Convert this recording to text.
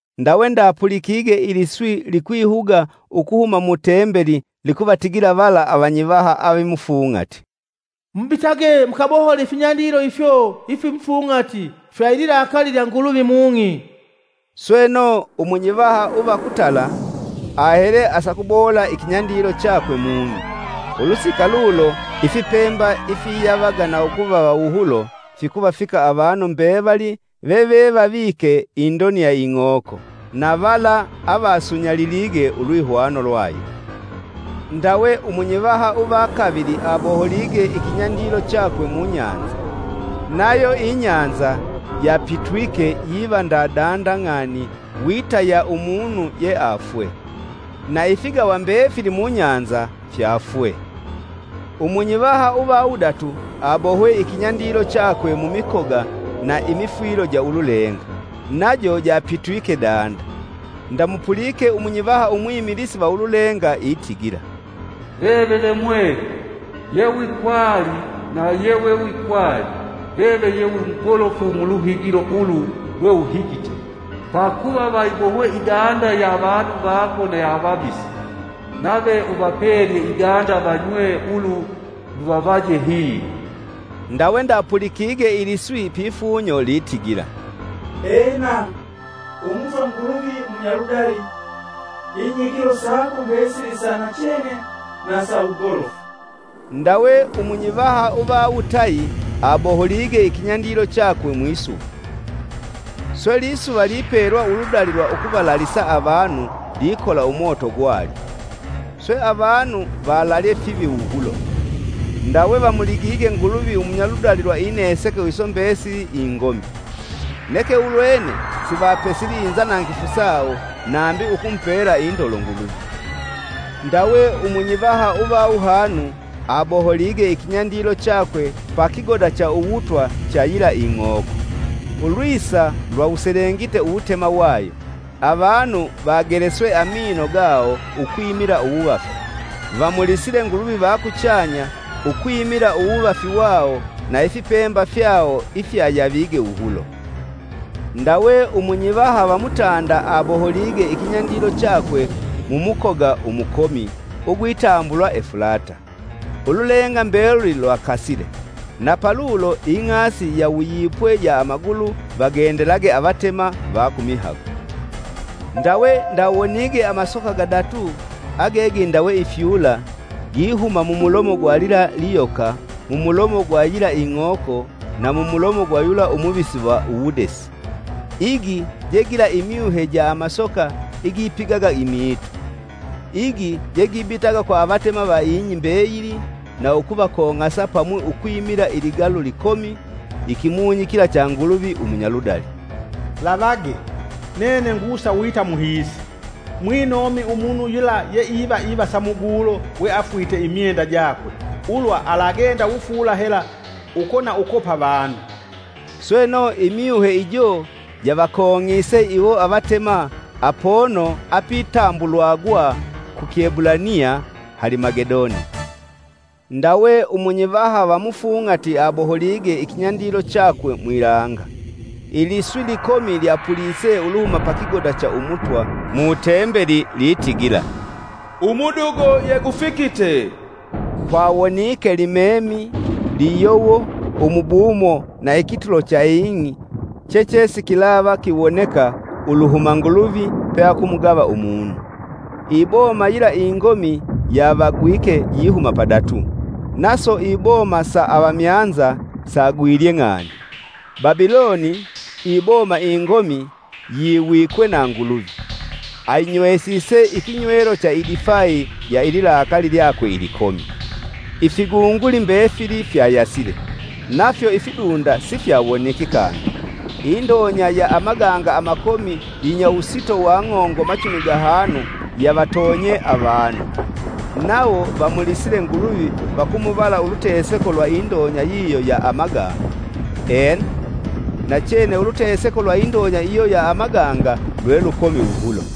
Ndawe ndapulikige iliswi likwihuga ukuhuma mu Tembeli likuvatigila vala avanyivaha avimufung'ati, “Mubitage mukabohole ifinyandilo ifyo ifimufung'ati fya ililakali lya Nguluvi mung'i.” Sweno, umunyivaha uva kutala ahele asakubohola ikinyandilo chakwe mung'i. Ulusika lulo ifipemba ifiyavaga na ukuvava wuhulo fikuvafika avanu mbevali vevevavike indoni ing'oko, na vala avasunyalilige ulwihwano lwayo. Ndawe umunyivaha uva kavili aboholige ikinyandilo chakwe mu bahali. Nayo ibahali yapitwike yiva nda ng'ani, wita ya umunu yeafwe, na ifigawa mbefili mubahali fyaafwe. Umunyivaha uva wudatu abohwe ikinyandilo chakwe mumikoga na imifwilo ja ululenga, najo japitwike danda. Ndamupulike umunyivaha umwimilisi va ululenga itigila, “Veve ve Mwelu, Yewikwali na yewewikwali! Veve ye wi mugolofu muluhigilo ulu lwe uhigite. Pakuva vayibohwe idanda ya avanu vako na ya avavisi, nave uvapelye idanda vanywe; Ulu luvavaje hilo!” Ndawe ndapulikige iliswi pifunyo litigila, Ena, Umutwa Nguluvi Munyaludali! Inyigilo sako mbesili sa nachene na sa wugolofu!” Ndawe umunyivaha uva wutayi aboholige ikinyandilo chakwe mwisuva. Swe lisuva lipelwa uludali lwa ukuvalalisa avanu likola umoto gwalyo. Swe, avanu valalye fivi wuhulo; ndawe vamuligige Nguluvi umunyaludali lwa ineseko iso mbesili ingomi. Neke ulwene sivapesili inzanangifu sawo nambi ukumupela indolo Nguluvi. Ndawe umunyivaha uva wuhanu abohwe ikinyandilo chakwe pa kigoda cha uwutwa cha yila ing'oko. Ulwisa lyawuselengite uwutema wayo, avanu vageleswe amino gawo ukwimila uwuvafi, vamulisile Nguluvi va kuchanya ukwimila uwuvafi wawo na ifipemba fyawo ifyayavige wuhulo. Ndawe umunyivaha va mutanda aboholige ikinyandilo chakwe mumukoga umukomi ugwitambulwa Efulata. Ululenga mbeluli lwakasile, na palulo ing'asi yawuyipwe ya amagulu vagendelage avatema va ku mihago. Ndawe ndawonige amasoka gadatu age gindawe ifyula, gihuma mumulomo gwa lila liyoka, mumulomo gwa yila ing'oko, na mumulomo gwa yula umuvisi va uwudesi. Igi jegila imyuhe ja amasoka igipigaga imiitu. Igi jegibitaga kwa avatema va ing'i mbeyili na ukuvakong'asa pamwi ukwimila iligalu likomi. Ikimunyi kila cha Nguluvi Umunyaludali. ( “Lavage! Nene ngusa wita muhiisi! Mwinomi umunu yula yeiva ivasa mugulo weafwite imyenda jakwe ulwa alagenda wufuula hela uko na uko pa vanu.”) Sweno, imyuhe ijo javakong'ise iwo avatema apono apitambulwagwa ku Kiebulaniya Halimagedoni. Ndawe umunyivaha va mufung'ati aboholige ikinyandilo chakwe mwilanga! Iliswi likomi lyapulise uluhuma pa kigoda cha Umutwa, mu Tembeli, litigila, “Umudugo yegufikite!” Kwawonike limemi, liyowo, umubumo na ikitulo cha ing'i, chechesikilava kiwoneka uluhuma Nguluvi peakumugava umunu. Iboma yila ingomi yavagwike yihuma padatu, naso iboma sa avamyanza sagwilye ng'ani. Babiloni, iboma ingomi, yiwikwe na Nguluvi. Ayinywesise ikinywelo cha idifai ya ililakali lyakwe ilikomi. Ifigunguli mbefili fyayasile, nafyo ifidunda sifyawoniki kangi. Indonya ya amaganga amakomi yinya wusito wa ng'ongo machumi gahanu yavatonye avanu, nawo vamulisile Nguluvi vakumuvala uluteseko lwa indonya yiyo ya amaganga. Ena, nachene uluteseko lwa indonya iyo ya amaganga lwe lukomi wuhulo.